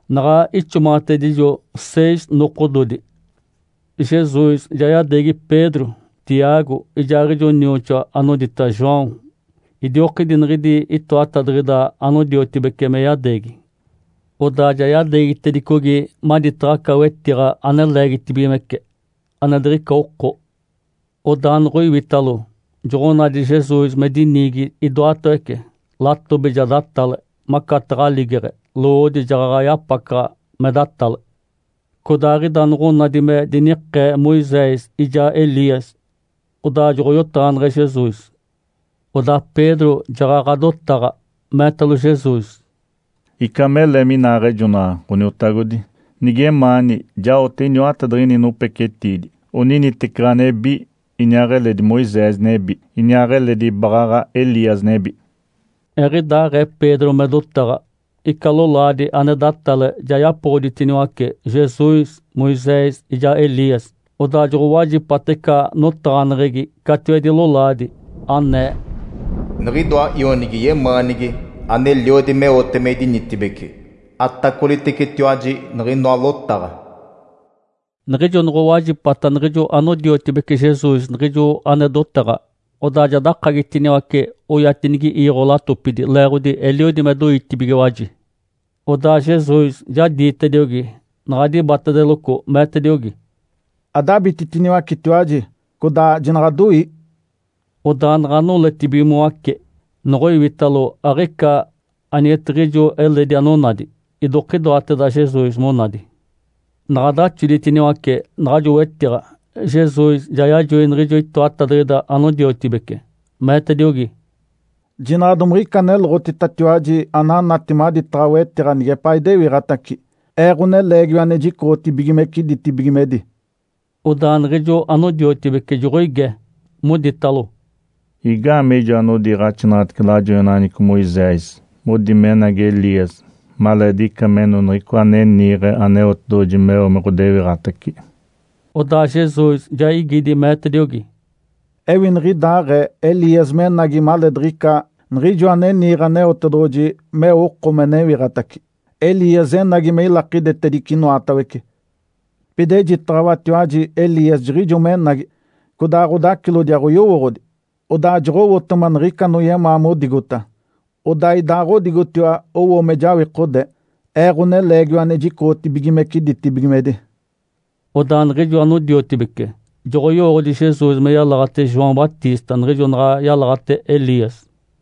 Naɡ̶a ixomaɡ̶atedijo seis nokododi, Jesus ja yadeegi Pedro, Tiago ijaaɡ̶ijo nioxoa anodita João, idiokidi niɡ̶idi itoatadiɡ̶ida anodiotibece me yadeegi. Odaa ja yadeegitedicogi maditaɡ̶a aca wetiɡ̶a ane leegitibigimece, ane diɡ̶ica oko. Odaa noɡ̶oiwitalo, joɡ̶onadi Jesus me diniigi idoatawece, latobi ja datale macataɡ̶a aligeɡ̶e, lowoodi jaɡ̶aɡ̶a yapacaɡ̶a me datale. Codaaɡ̶ida noɡ̶onadi me dinikee Moisés ijaa Elias, odaa joɡ̶oyotaɡ̶aneɡ̶e Jesus. Odaa Pedro jaɡ̶aɡ̶a dotaɡ̶a, meetalo Jesus, “Ica mele minaaɡ̶ejonaɡ̶a, Ǥoniotagodi. Nigemaani, jaote iniwatadiɡ̶ini nopecetiidi, oniniteci ɡ̶anebi, iniaaɡ̶eledi Moisés nebi, iniaaɡ̶eledi baɡ̶aɡ̶a Elias nebi.” Eɡ̶idaaɡ̶ee Pedro me dotaɡ̶a, ica lolaadi ane datale ja yapoɡ̶oditiniwace Jesus, Moisés ijaa Elias. Odaa joɡ̶owajipata ica notaɡ̶aneɡ̶egi catiwedi lolaadi, anee, “Niɡ̶idoa Ionigi yemaanigi, aneliodi meote me idinitibeci. Atacolitecetiwaji niɡ̶inoa lotaɡ̶a!” Niɡ̶ijo noɡ̶owajipata niɡ̶ijo anodiotibece Jesus niɡ̶ijo ane dotaɡ̶a, odaa ja dakagitiniwace oyatedini iiɡ̶o latopidi, leeɡ̶odi eliodi me doitibigiwaji. Odaa Jesus ja diitediogi, naɡ̶a dibatedeloco, meetediogi, “Adabititiniwacetiwaji, codaa jinaɡ̶adoii!” Odaa naɡ̶a noletibigimoace, noɡ̶oiwitalo, aɡ̶ica anigetiɡ̶ijo eledi anonadi, idokidoateda Jesus monadi. Naɡ̶a daxoditiniwace naɡ̶ajo wetiɡ̶a, Jesus ja yajoi niɡ̶ijo itoatadiɡ̶ida anodiotibece, meetediogi, “Jinaɡ̶a domiɡ̶ica aneloɡ̶ititatiwaji ananati maditaɡ̶a wetiɡ̶a nigepaa idewiɡ̶atace, Ee, Ǥoneleegiwa ane jicoɡ̶otibigimece ditibigimedi.” Odaa niɡ̶ijo anodiotibece joɡ̶oige, moditalo, “Igaamee ijo anodiiɡ̶axinaɡ̶atece lajoinaɡ̶aneɡ̶eco Moisés modi menagi Elias maleediɡ̶ica meno Niɡ̶icoa ane niiɡ̶e Aneotedoɡ̶oji meo me ɡ̶odewiɡ̶atace?” Odaa Jesus ja igidi, meetediogi, “Ewi niɡ̶idaaɡ̶ee Elias menagi maleediɡ̶ica Niɡ̶ijoa ane niiɡ̶e Aneotedoɡ̶oji meo oko me newiɡ̶atace. Elias enagi me ilakidetedice inoatawece. Pida ejitaɡ̶awatiwaji Elias jiɡ̶ijo menagi, codaa ɡ̶odacilodi aɡ̶oyowooɡ̶odi, odaa joɡ̶owotema niɡ̶ica anoyemaa modigota. Odaa idaaɡ̶odigotiwa owo me jawikode, Ee, Ǥoneleegiwa ane jicoɡ̶otibigimece ditibigimedi.” Odaa niɡ̶ijo anodiotibece joɡ̶oyowooɡ̶odi Jesus me yalaɡ̶ate João Batista niɡ̶ijo naɡ̶a yalaɡ̶ate Elias.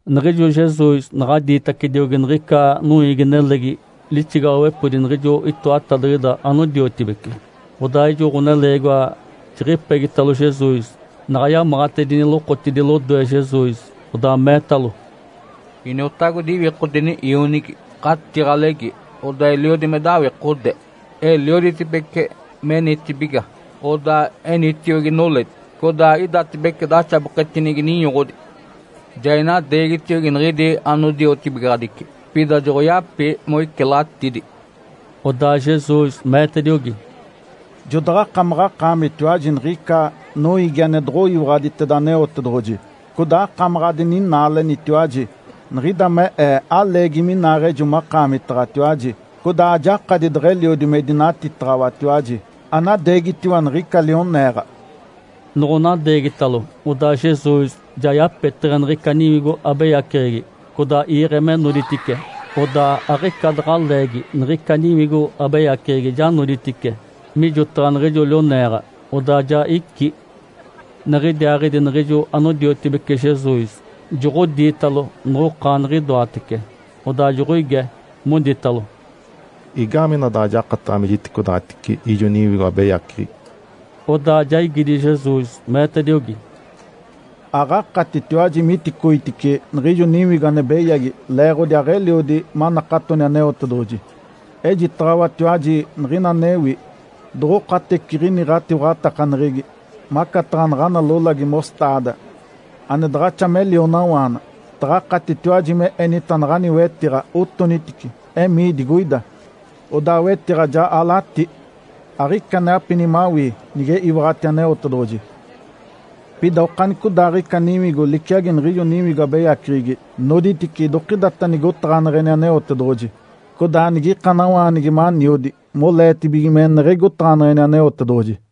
Niɡ̶ijo Jesus naɡ̶a diitacediogi niɡ̶ica noiigi-nelegi lixigaɡ̶awepodi niɡ̶ijo itoatadiɡ̶ida anodiotibece, odaa ijo ɡ̶oneleegiwa jiɡ̶ipegitalo Jesus. Naɡ̶a yamaɡ̶atedini lokotidi lodoe Jesus, odaa meetalo, “Iniotagodi, iwikodeni ionigi! Ǥatiɡ̶alegi, odaa eliodi me dawikode, elioditibece menitibiga, odaa enitiogi noledi, codaa idatibece daxaboketinigi ninyoɡ̶odi. Ja inadeegitiogi niɡ̶idi anodiotibigaɡ̶adici, pida joɡ̶oyapi moicilatidi.” Odaa Jesus meetediogi, “Jodaɡ̶akamaɡ̶akaamitiwaji niɡ̶ica noiigi ane doɡ̶oyiwaɡ̶aditeda Aneotedoɡ̶oji, codaa akamaɡ̶a adininaalenitiwaji. Niɡ̶ida me Ee aleegi minaaɡ̶ejo makaamitaɡ̶atiwaji, codaa ajakadi deɡ̶eliodi me idinatitaɡ̶awatiwaji. Anadeegitiwa niɡ̶ica lioneeɡ̶a!” Noɡ̶onadeegitalo, odaa Jesus ja yapeteɡ̶e niɡ̶ica niwigo abeyaceɡ̶egi, codaa iiɡ̶e me noditice. Odaa aɡ̶ica daɡ̶a leegi, niɡ̶ica niwigo abeyaceɡ̶egi ja noditice mijotaɡ̶a niɡ̶ijo lioneeɡ̶a, odaa ja icí. Niɡ̶idiaaɡ̶idi niɡ̶ijo anodiotibece Jesus joɡ̶odiitalo noɡ̶okaaniɡ̶idoatece, odaa joɡ̶oige, moditalo, “Igaamee ina daɡ̶a jakataɡ̶a me jiticodaɡ̶atice ijo niwigo abeyaceɡ̶egi?” Odaa ja igidi Jesus, meetediogi, “Aɡ̶akatitiwaji miticoitice niɡ̶ijo niwigo ane beyagi leeɡ̶odi aɡ̶eliodi manakatoni Aneotedoɡ̶oji. Ejitaɡ̶awatiwaji niɡ̶ina anewi. Doɡ̶okateciɡ̶ini ɡ̶atiwaɡ̶atakaneɡ̶egi, macataɡ̶a naɡ̶ana lolagi ‘mostaada’ ane daɡ̶axa me lionawaana, taɡ̶akatitiwaji me enita naɡ̶ani wetiɡ̶a, ‘Otonitice, emii digoida!’ Odaa wetiɡ̶a ja alatí. Aɡ̶ica ane apini mawii, nige iwaɡ̶ati Aneotedoɡ̶oji. Pida okanicodaaɡ̶ica niwigo liciagi niɡ̶ijo niwigo abeyaceɡ̶egi noditice idokidata nigotaɡ̶aneɡ̶eni Aneotedoɡ̶oji, codaa nige ikanawaanigi maniodi moleetibige meneɡ̶egi otaɡ̶aneɡ̶eni Aneotedoɡ̶oji.”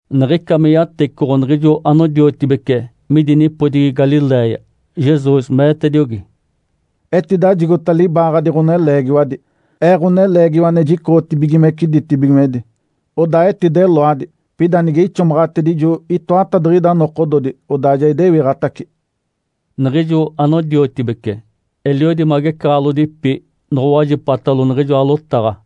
Niɡ̶ica me yatecoɡ̶o niɡ̶ijo anodiotibece midi nipodigi Galiléia, Jesus meetediogi, “Etidajigota libaaɡ̶adi ɡ̶oneleegiwadi, Ee, Ǥoneleegiwa ane jicoɡ̶otibigimece ditibigimedi. Odaa etideloadi, pida nige ixomaɡ̶atedijo itoatadiɡ̶ida nokododi, odaa ja idewiɡ̶atace.” Niɡ̶ijo anodiotibece eliodi magecaɡ̶alodipi noɡ̶owajipatalo niɡ̶ijoa lotaɡ̶a.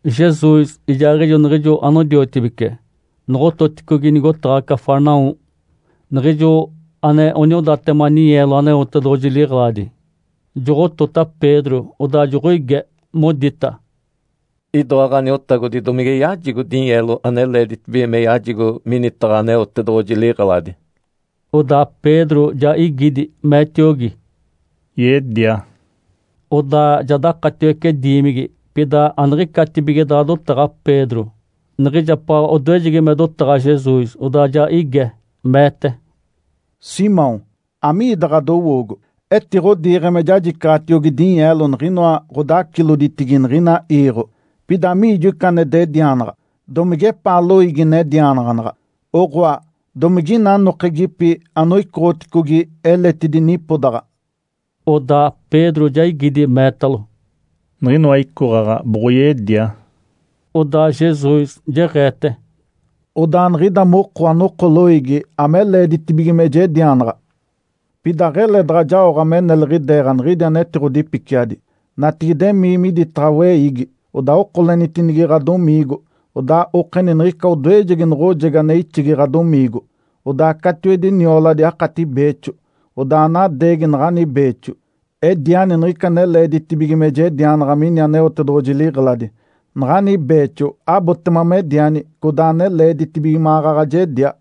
Jesus ijaaɡ̶ijo niɡ̶ijo anodiotibece noɡ̶ototicogi nigotaɡ̶a Cafarnaum, niɡ̶ijo ane oniodatema ninyeelo Aneotedoɡ̶oji liɡ̶eladi, joɡ̶otota Pedro, odaa joɡ̶oige, modita, “Idoa ɡ̶aniotagodi domige yajigo dinyeelo ane leeditibige me yajigo minitaɡ̶a Aneotedoɡ̶oji liɡ̶eladi?” Odaa Pedro ja igidi, meetiogi, “Yedia.” Odaa ja dakatiwece diimigi. Pida aniɡ̶icatibige daɡ̶a dotaɡ̶a Pedro, niɡ̶ijapaɡ̶a odoejegi me dotaɡ̶a Jesus, odaa ja ige, meete, “Simão, amiida ɡ̶adowoogo? Etiɡ̶odiiɡ̶e me jajicaɡ̶atiogi dinyeelo niɡ̶inoa ɡ̶odaciloditigi niɡ̶ina iiɡ̶o. Pida amiijo ica ane dedianaɡ̶a? Domigepaa loiigi nedianaɡ̶anaɡ̶a, oɡ̶oa, domigina anokegipi anoicoɡ̶oticogi eletidi nipodaɡ̶a?” Odaa Pedro ja igidi, meetalo, “Niɡ̶inoa icoɡ̶aɡ̶a boɡ̶oyedia.” Odaa Jesus jeɡ̶eete, “Odaa niɡ̶ida moko anoko loiigi ame leeditibige me jedianaɡ̶a. Pida aɡ̶ele daɡ̶a jaoɡ̶a me neliɡ̶ideeɡ̶a niɡ̶idi anetiɡ̶odipiciadi. Natigide, emii miditaɡ̶a weiigi, odaa okolenitini ɡ̶adomiigo. Odaa okeni niɡ̶ica odoejegi noɡ̶ojegi ane ixigi ɡ̶adomiigo. Odaa catiwedi nioladi akati beexo. Odaa anadeegi naɡ̶ani beexo, ediani niɡ̶ica ane leeditibige me jedianaɡ̶a mini Aneotedoɡ̶oji liɡ̶eladi. Naɡ̶ani beexo abotema mediani codaa ane leeditibige maɡ̶aɡ̶a jedia.”